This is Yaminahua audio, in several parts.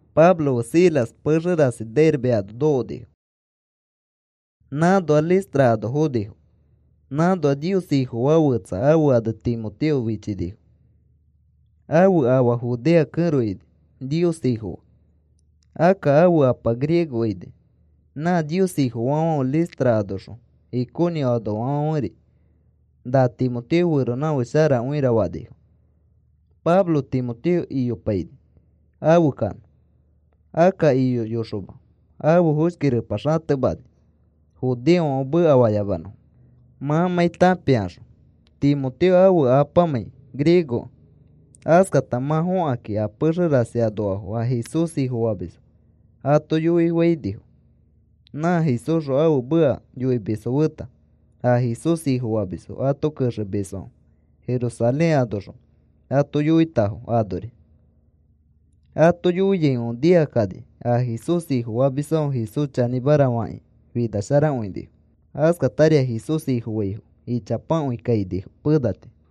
Pablo fe Silas pexe rasi Derbe ano nokonifo, nãnoax Listra ano fonifo. Nãnoa Nios Ifofaa fetsa ãfe ane Timoteo fichinifo. Ãfe afa Judea kẽro ini, Nios Ifofa, akka ãfe apa griego ini. Nã Nios Ifofaafãfe Listra anoxõ Iconio anoafãferi, “Na Timoteo feronãfake sharakõira,” fanifo. Pablo Timoteo iyopaini afe kanõ. Akka iyoyoxoma ãfe foshki repa xatemani, judeofãfe mekafayamanõfo, mãmãi tãpikaxõ Timoteo ãfe apamãi griegokẽ. Askata mã fokakĩ a pexe rasi anoafo a Jesús Ifofamisfo ato yoifainifo, nã Jesúsxõ ãfe meka yoimisfo feta, a Jesús Ifofamisfo ato kexemisfãfe Jerusalén anoxõ ato yoitafo anori. Ato yoiaifãfe nikakani a Jesús Ifofamisfãfe Jesús chanĩmara fakĩ finasharakõinifo. Askatari a Jesús Ifofaifo ichapakõi kainifo pena tii.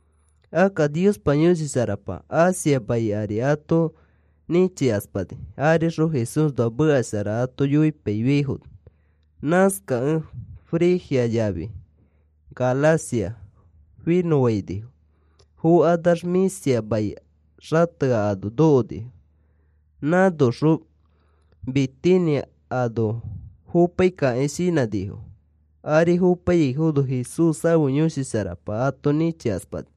Akka Niospa Yõshi Sharapa, Asia mai ari ato nĩchikaspani, arixõ Jesúsnoa meka shara ato yoipaifiaifono. Nãskakẽ Frigia yafi Galacia finõfainifo. Fokanax Misia mai xatea ano nokonifo. Nãnoxõ Bitinia ano fopaikakĩ shinãnifo, ari fopaiyaifono Jesús ãfe Yõshi Sharapa ato nĩchikaspani.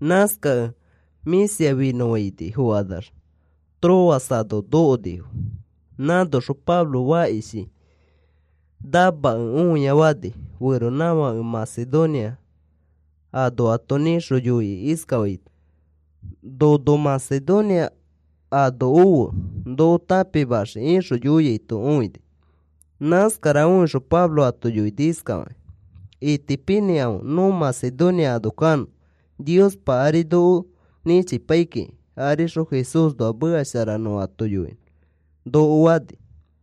Nãskakẽ Misia finõfaini fokanax Troas ano nokonifo. Nãnoxõ Pablo fakishi namakẽ õia fani, feronãfake Macedonia anoato nĩxõ yoikĩ iskafaito: “Nono Macedonia ano ofe noko tãpimaxiki,” ixõ yoiaito õini. Nãskara õixõ Pablo ato yoini iskafakĩ: “Itipinĩkãfe nõ Macedonia ano kanõ, Niospa ari noko nĩchipai kiki arixõ Jesúsnoa meka shara nõ ato yoinõ,” noko fani.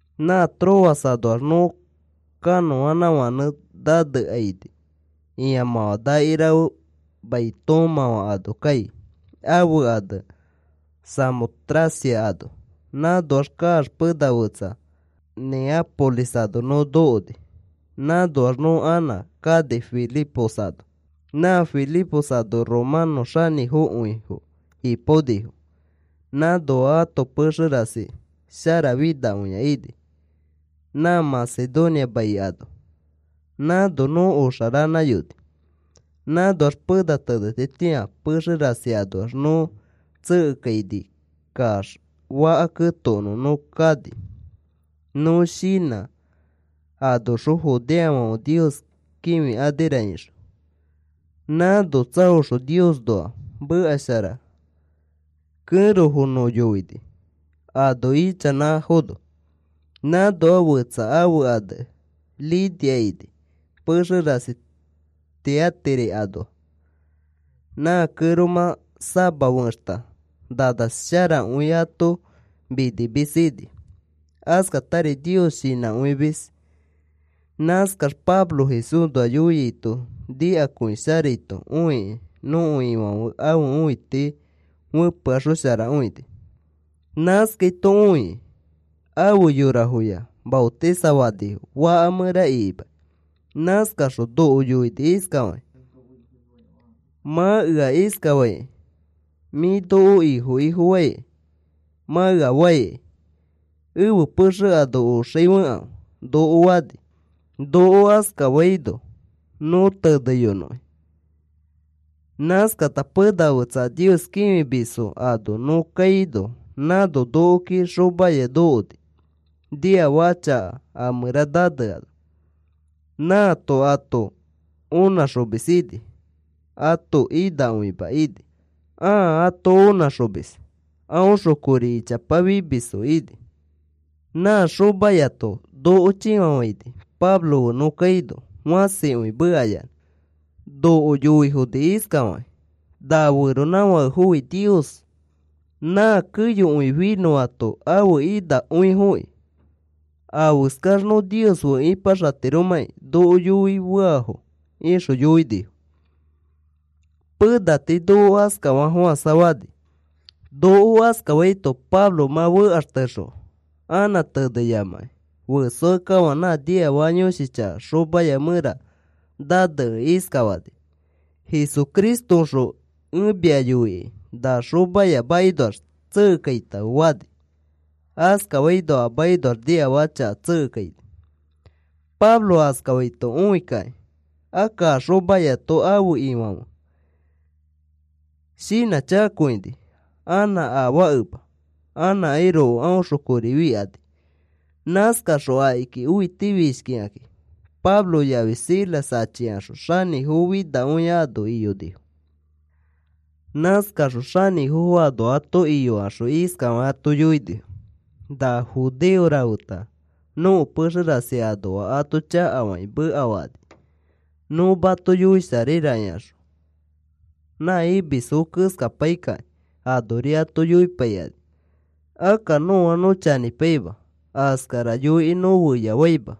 Nã Troas anoax nõ kanõanãfãnẽ nanekaini ĩamãfã nakirafe mai toomãfã ano kai ãfe ane Samotracia ano. Nãnoax kaax pena fetsa Neápolis ano nõ nokoni. Nãnoax nõ anã kani Filipos ano. Nã Filipos ano romanõ xanĩfokõifo ipaonifo nãnoa ãto pexe rasi sharafinakõia ini, nã Macedonia mai ano. Nãno nõ oxa ranãyoni. Nãnoax pena tenetitĩa pexe rasi anoax nõ tsekekainikax faka ketokonõ nõ kani, nõ shinã anoxõ judeofãfe Nios kĩfikanira ixõ. Nãno tsaoxõ Niosnoa meka shara kẽrofo nõ yoini ano ichanãfono. Nãnoa fetsa ãfe ane Lidia ini pexe rasi Tiatira anoa. Nã kẽromã sama fexta nana sharakõi ato minimis ini. Askatari Nios shinãkõimis. Nãskaxõ Pablo Jesúsnoa yoiaito nikakõisharaito õikĩ nõko Ifãfe ãfe õiti fepeaxosharakõini. Nãskaito õikĩ afe yorafoya maotisafanifo faka mẽra ikimakĩ. Nãskaxõ noko yoini iskafakĩ: “Mã ea iskafaikai, mĩ nõko Ifo ifofaki mã ea faikai, ẽfe pexe ano oxai fekãfe,” noko fani. Noko askafaino nõ nẽteyoni. Nãskata pena fetsa a Nios kĩfimisfo ano nõ kaino nãno nokoki xomaya nokoni niafaka chaka a mẽra naneano. Nãato ato õnãxomis ini. Ãto inakõima ini, ãa ato onãxomis. Aõxõ kori ichapa fimisfo ini. Nã xomayato noko chĩfafaini Pablo fe nõ kaino fãsikõi mekayanã noko yoifoni iskafakĩ: “Na feronãfakefofi Nios nã keyokõi finõato ãfe inakõifoki. Afeskax nõ Nios fe ipaxatiromãki noko yoi feafo,” ixõ yoini. Pena tii noko askafafofãsa fani. Noko askafaito Pablo mã fekaxtexõ anã teneyamakĩ, ifiakekafã nã niafaka yõshi chaka xomaya mẽra nanekẽ iskafani: “Jesucristoõxõ ẽ mia yoikai na xomaya makinoax tsekekaitãfe,” fani. Askafaino a makinoax niafaka chaka tsekekaini. Pablo askafaito õikakĩ, akka a xomayato ãfe ifofãfe shinãchakakõinifo anã afaakema, anãkairoko aõxõ kori fikani. Nãskakaxõ akiki õitifishkikakĩ Pablo yafi Silas achikaxõ xanĩfo finakõia ano iyonifo. Nãskakaxõ xanĩfofo ano ato iyokaxõ iskafakĩ ato yoinifo: “Na judeo rafeta nõko pexe rasi anoa ato chakafakĩ mekafakani. Nõ mato yoisharaira ikaxõ nã imisfo keskapaikĩ anori ato yoipaikani. Akka nõa nõ chanĩpaima, askara yoikĩ nõ feyafaima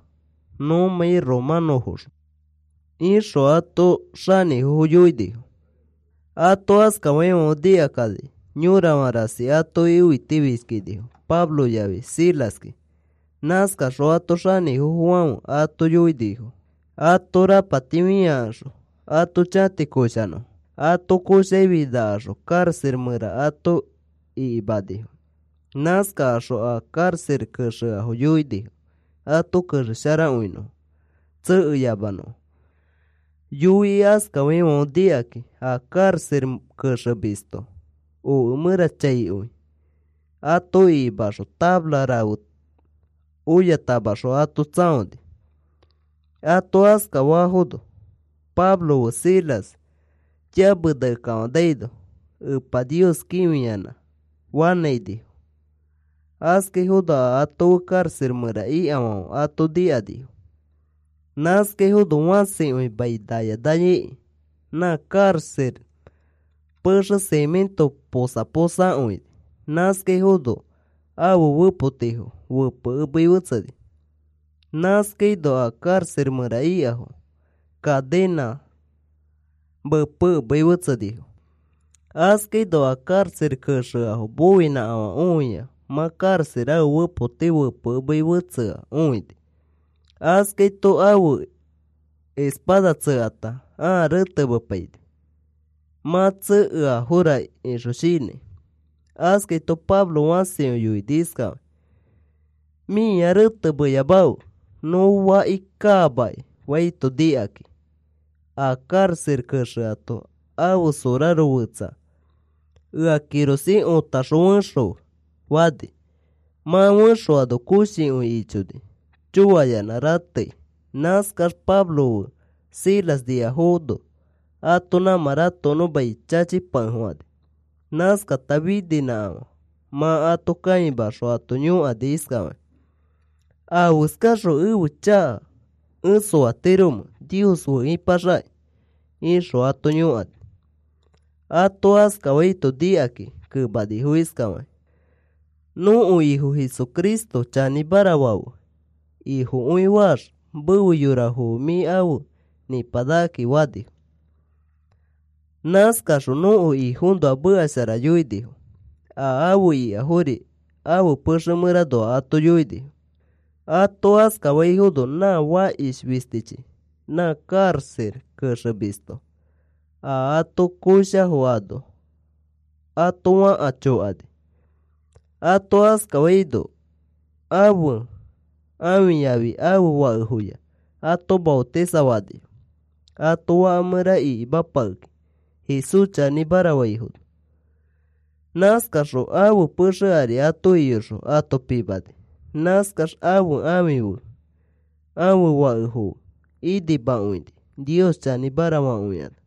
nõmãi romanõfoxõ,” ixõ ato xanĩfofo yoinifo. Ato askafaifãfe nikakani yorafã rasi atoki õitifishkinifo Pablo yafi Silaski. Nãskakaxõ ãto xanĩfofofafẽ ato yoinifo ato rapati fĩakaxõ ato chati koshanõfo. Ato koshakĩ finakaxõ karaxa mẽra ato ikimanifo. Nãskakaxõ a karaxa kexea yoinifo ato kexesharakõinõ tsekeyamanõfo. Yoikĩ askafaifãfe nikakĩ, a karaxa kexemisto oke mẽra chaikõi ato ikimaxõ tafara rafe oyatamaxõ ato tsãoni. Ato askafafono Pablo fe Silas yamenakekafanaino Epa Nios kĩfiyanã fanãinifo. Askaifono a ato fe karaxa mẽra ikafãfe ato nikanifo. Nãskaifono fãsikõi mai naya naya ikĩ, nã karaxa pexe simĩto posa posa akõini. Nãskafaino ãfe fepotifo fepekemei fetseni. Nãskaino a karaxa mẽra ikafo cadenãs mepekemei fetsenifo. Askaino a karaxa kexea moinãkafã õia mã karaxa ãfe fepoti fepekemei fetsea õini. Askaito ãfe espada tsekata ãa retemepaini, mã tsekeafora ixõ shinãi. Askaito Pablo fãsikõi yoini iskafakĩ: “Mĩa retemeyamafe. Nõ faki kaamaki,” faito nikakĩ. A karaxa kexeato ãfe soraro fẽtsa, “Ea kirosĩ otaxõ fexõfe,” fani. Mã fexoano koshikõi ichoni choayanã ratei, nãskax Pablo fe Silas niafono ato nãmã ratokonõ mai chachipakefofãni. Nãskata fininãkãfe mã ato kaimaxõ ato yõkani iskafakĩ: “¿Afeskaxõ ẽfe chaka ẽ soatiromẽ Nios fe ipaxakĩ?” ixõ ato yõkani. Ato askafaito nikakakĩ kemanifo iskafakakĩ: “Nõko Ifo Jesucristo chanĩmara fafe Ifokõi faax mefe yorafo fe mĩ afe nĩpanakakĩ,” fanifo. Nãskakaxõ nõko Ifoõnoa meka shara yoinifo, a afe ikafori ãfe pexe mẽranoa ato yoinifo. Ato askafaifono nã fakish fistichi nã karaxa kexemisto a ato koshafo ano ato fãka chokani. Ato askafaino ãfe ãfiyafi ãfe fakefoya ato maotisafanifo, ato faka mẽra ikimapakekakĩ Jesús chanĩmara faifono. Nãskaxõ ãfe pexe ari ato iyoxõ ato pimani. Nãskax ãfe ãfi fe ãfe fakefo fe inimakõini Nios chanĩmara fakõikanax.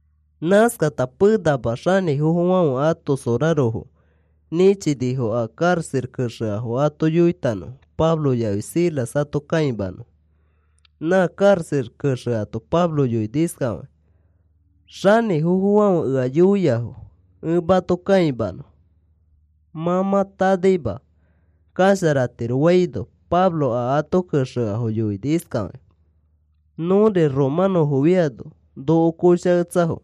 Nãskata penama xanĩfofofãfe ãto sorarofo nĩchinifo a karaxa kexeafo ato yoitanõfo Pablo yafi Silas ato kãimanõfo. Nã karaxa kexeato Pablo yoini iskafakĩ: “Xanĩfofofãfe ea yoiafo ẽ mato kãimanõ. Mã mã tanaima kasharatiro,” faino, Pablo a ato kexeafo yoini iskafakĩ: “Nõri romanõfofiano noko koshaketsafo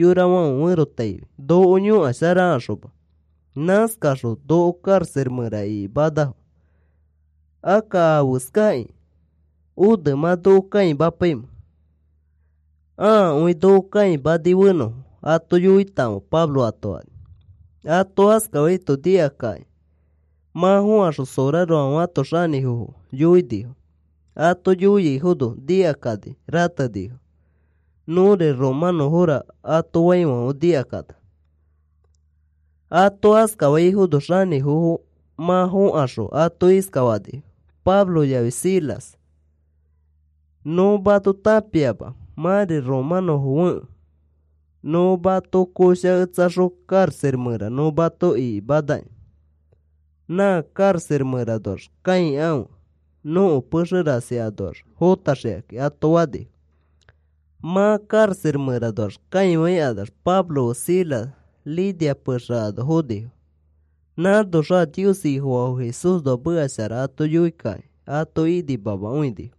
yorafãfe ferotaifi, noko yõkasharakaxoma. Nãskakaxõ noko karaxa mẽra ikimanafo. Akka, ¿afeskakĩ one mã noko kãimapaimẽ? Ãakõi noko kãimani fenõfo ato yoitakãfe,” Pablo ato fani. Ato askafaito nikakakĩ mã fokaxõ sorarofãfe ato xanĩfofo yoinifo. Ato yoiaifono nikakani ratenifo: “Nõri romãnõfora,” ato faifãfe nikakanax. Ato askafaifono xanĩfofo mã fokaxõ ato iskafanifo, Pablo yafi Silas: “Nõ mato tãpiama mãri romanõfo fekẽ nõ mato koshaketsaxõ karaxa mẽra nõ mato ikimanaki. Na karaxa mẽranoax kãikãfe, nõko pexe rasi anoax fõtaxikakĩ,” ato fanifo. Mã karaxa mẽranoax kãikanax Pablo fe Silas Lidia pexe ano fonifo. Nãnoxõ a Nios Ifofaafo Jesúsnoa meka shara ato yoikakĩ ato inimamakõinifo.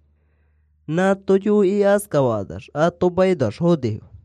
Nãato yoikĩ askafakanax ato makinoax fonifo.